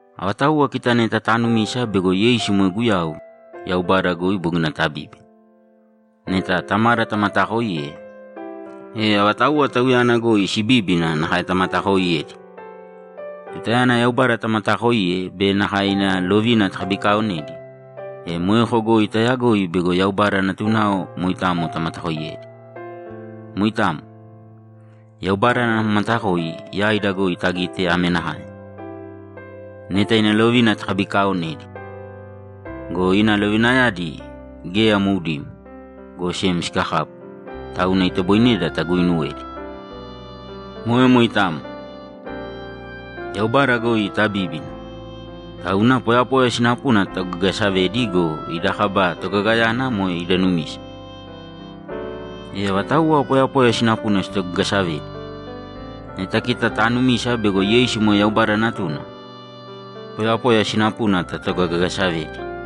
Avatauwa kita neta taanumisa bego Yeisu moe Guyau, Yaubada goi bogina tabíbina. Neta Tamada tamataakoiye, e avatauwa Tauyana goi sibíbina nakae tamatakooiyedi. Tutayana Yaubada tamataakoiye be nakae ina lovina takabikaaonedi, e moeko goi taayagoi bego Yaubada natunao moitamo tamatakoiyedi. Moitamo. Yaubada ana matakoi yaida goi tagite ame nakae: Neta ina lovina takabikaaonedi. Go ina lovinayadi geya moudimo, go sem sikakapu, tauna itoboineda taguuinuwedi. Moe moitamo. Yaubada goi tabíbina, tauna poyapoya sinapuna tatogagasavedi go, ida kaba togagayana moe ida numisa. E avatauwa poyapoya sinapuna sitogagasavedi? Neta kita taanumisa bego Yeisu moe Yaubada Natuna, poyapoya sinapuna tatogagasavedi.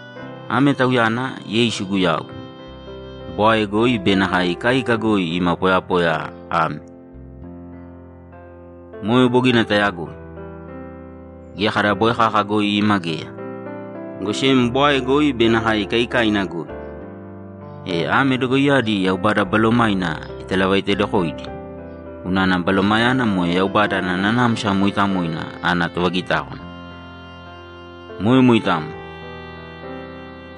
Ame Tauyana, Yeisu Guyau, bwae goi be nakae ikaika goi ima poyapoya ame. Moe bogina tayagoi. Geya kada bwae kaka goi ima geya, go sem bwae goi be nakae ikaikaina goi. E ame dogoiyadi Yaubada Balomaina italavaitedokoidi, unana Balomayana moe Yaubada ana Nanamsa Mooitamoina ana tovagitákwana. Moe moitamo.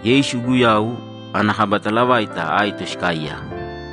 Yeisu Guyau ana kaba talavaita aito sikaaiyaka.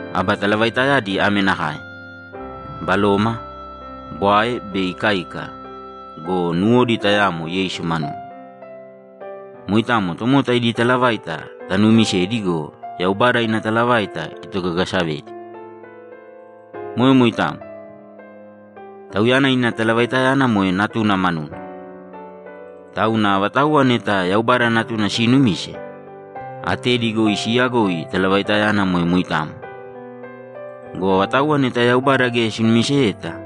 Aba talavaitayadi ame nakae: Baloma, bwae be ikaika go, nuwodi tayamo Yeisu manuna. Moitamo tomota idi talavaita tanuumisedi go, Yaubada ina talavaita itogagasavedi. Moe moitamo. Tauyana ina talavaitayana moe Natuna manuna. Tauna avatauwa neta Yaubada Natuna siinumise, atedi goi siiyagoi talavaitayana moe moitamo. Go avatauwa neta Yaubada geya sinumiseyeta,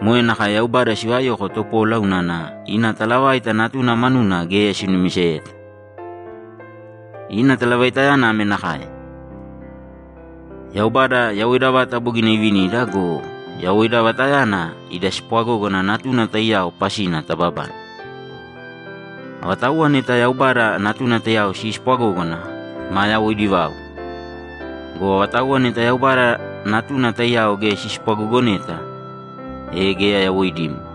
moe nakae Yaubada sivayoko topola unana ina talavaita Natuna manuna geya sinumiseyeta. Ina talavaitayana ame nakae: Yaubada yawoida vata bogina ivinida go, yawoida vatayana ida spwagógana Natuna taiyao pasina tababane. Avatauwa neta Yaubada Natuna taiyao siispwagógana, maa yawoidi vau. Go avatauwa neta Yaubada Natuna taiyao geya sispwagogoneta, e geya yawoidimo.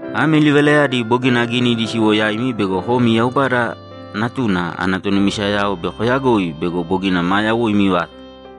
Ame livalayadi bogina aginidi siwo yaimi bego komi Yaubada Natuna ana tonumisayao bei koyagoi bego bogina maa yawoimi vata.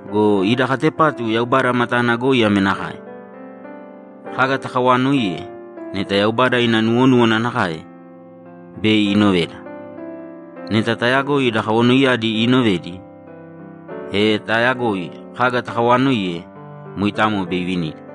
Go ida katepatu Yaubada matana goi ame nakae: Kaga takawaanoiye, neta Yaubada ina nuwonúwana nakae, bei inoveda. Neta taayagoi ida kawanoiyadi iinovedi, e taayagoi kaga takawaanoiye, moitamo bei ivinida.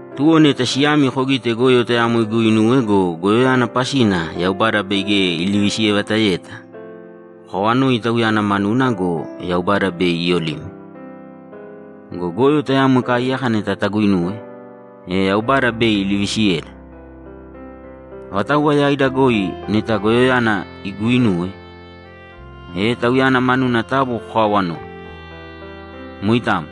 Tuwo neta siyami kogite goyo tayamo iguuinuwe go, goyoyana pasina Yaubada bei geya ilivisiyevataeyeta, kokawanōi tauyana manuna go, Yaubada bei iyolime. Go goyo tayamo ikaaiyaka neta taguinuwe, e Yaubada bei ilivisiyeda. Avatauwa yaida goi neta goyoyana iguuinuwe, e tauyana manuna taabu kokaawanōi. Moitamo.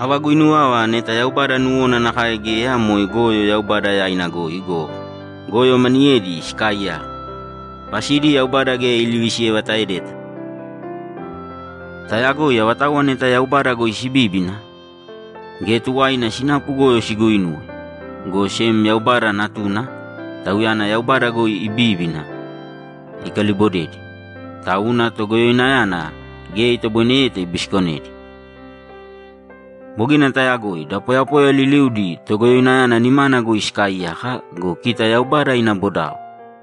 Ava guinuwava neta Yaubada nuwona nakae geya moe goyo Yaubada yaina goi go, goyo maniyedi sikaaiyaka, pasidi Yaubada geya ilivisiyevataedeta. Tayagoi avatauwa neta Yaubada goi sibíbina, geya tuwaina sinapu goyo siguuinuwe, go sem Yaubada Natuna, Tauyana Yaubada goi ibíbina, ikalibodedi, tauna Togoyoinayana geya itoboineyeta ibisikonedi. Bogina tayagoi da poyapoya liliudi Togoyoinayana nimana goi sikaaiyaka go, kita Yaubada ina bodao.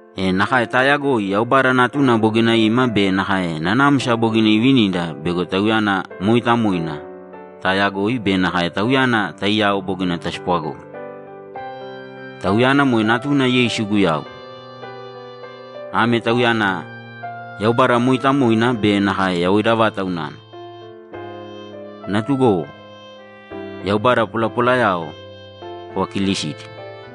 E nakae taayagoi Yaubada Natuna bogina ima be nakae nanamsa bogina ivinida bego Tauyana mooitamoina taayagoi be nakae Tauyana taiyao bogina taspwagógana. Tauyana moe Natuna Yeisu Guyau. Ame Tauyana Yaubada mooitamoina be nakae yawoida vata unana. Natugowo, yaubada polapolayao kovakiilisīdi.